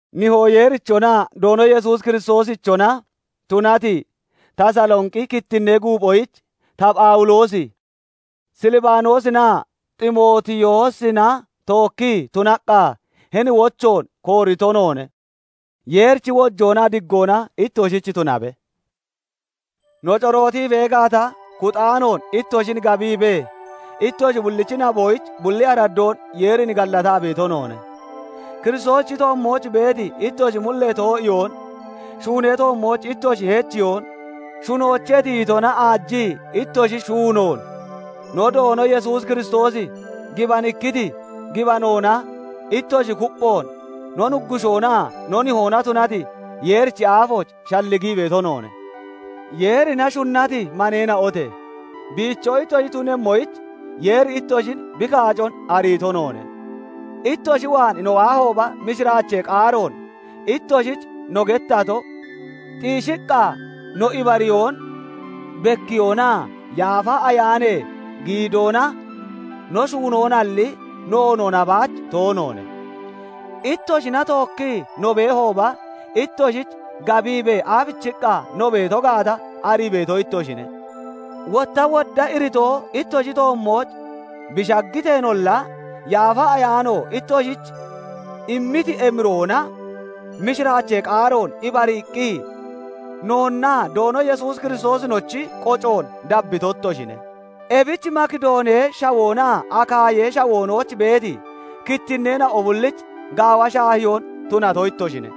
Nihoo Yeerichonaa Doono Yesuus Kiristoosichona tunati, Tasalonqi kittinnee guuphoyich, ta Phawuloosi, SiLibanoosinaa Ximootiyoosina tookkii tunaqqa hini wochoon koorito noone. Yeerichi wojoonaa diggoona ittoshich tunabe. No corootii bee gaata, kuxaanoon ittoshin gabiibee, ittoshi bullichi naboyich bulli araddoon Yeerin gallataa beeto noone; Kiristoosichi toommooch beeti ittoshi mullee too'iyoon shuunee toommooch ittoshi heechiyoon, shunoochee tiyitona aajii ittoshi shuunoon, no Doono Yesuus Kiristoosi gibanikkiti gibanoona ittoshi kupphoon no Nuggushoonaa no Nihoona tunati Yeerichi aafooch shalligii beeto noone. Yeerina shunnati no maneena'ote! Biicho ittoshi tunemmoyich Yeeri ittoshin bi kaacon ariito noone. Ittoshi waan no waahooba, mishiraachee qaaroon ittoshich no gettato, xiishiqqa no ibariyoon bekkiyoonaa Yaafa Ayaanee giidoona no shuunoonalli, noonoona baach toonoone. Ittoshina tookkii no beehooba, ittoshich gabiibee aabichiqqa no beeto gaata arii beeto ittoshine. Wotta wodda iritoo ittoshi toommooch bi shaggiteenolla, Yaafa Ayaano ittoshich immiti emiroona mishiraachee qaaroon ibariiqqi, noonnaa Doono Yesuus Kiristoosinochi qocoon dabbito ittoshine; ebich Makidoonee Shawoonaa Akaayee Shawoonooch beeti kittinneena'o bullich gaawa shaahiyoo tunato ittoshine.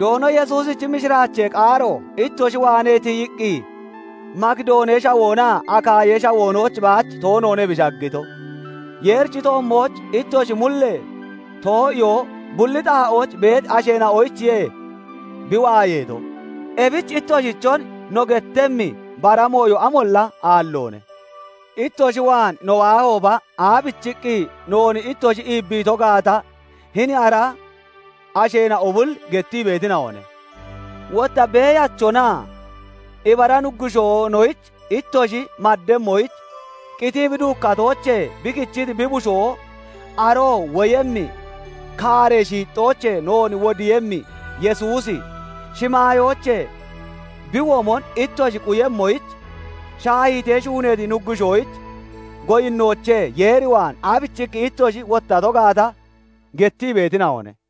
Doono Yesuusichi mishiraachee qaaro ittoshi waanee tiyiqqi Makidoonee Shawoonaa Akaayee Shawoonooch baach toonoone bi shaggito; Yeerichi toommooch ittoshi mullee too'iyoo bulli xaa'ooch beeti asheena'oyichiye bi waayeeto; ebich ittoshichon no gettemmi bara mooyo amolla aalloone. Ittoshi waan no waahooba, aabichiqqi noon ittoshi iibbiito gaata hini ara asheena'o bulli gettii beetina'one; wotta beeyachonaa ibara Nuggushoonoyich ittoshi maddemmoyich, qitii bi duukkatoochee bi kichiti bi Bushoo, aroo woyemmi kaaree shiixxoochee noon wodiiyemmi Yesuusi, shimaayoochee bi womon ittoshi quyemmoyich, shaahiitee shuuneeti nuggushoyich goyinnoochee Yeer waan aabichiqqi ittoshi wottato gaata gettii beetina'one.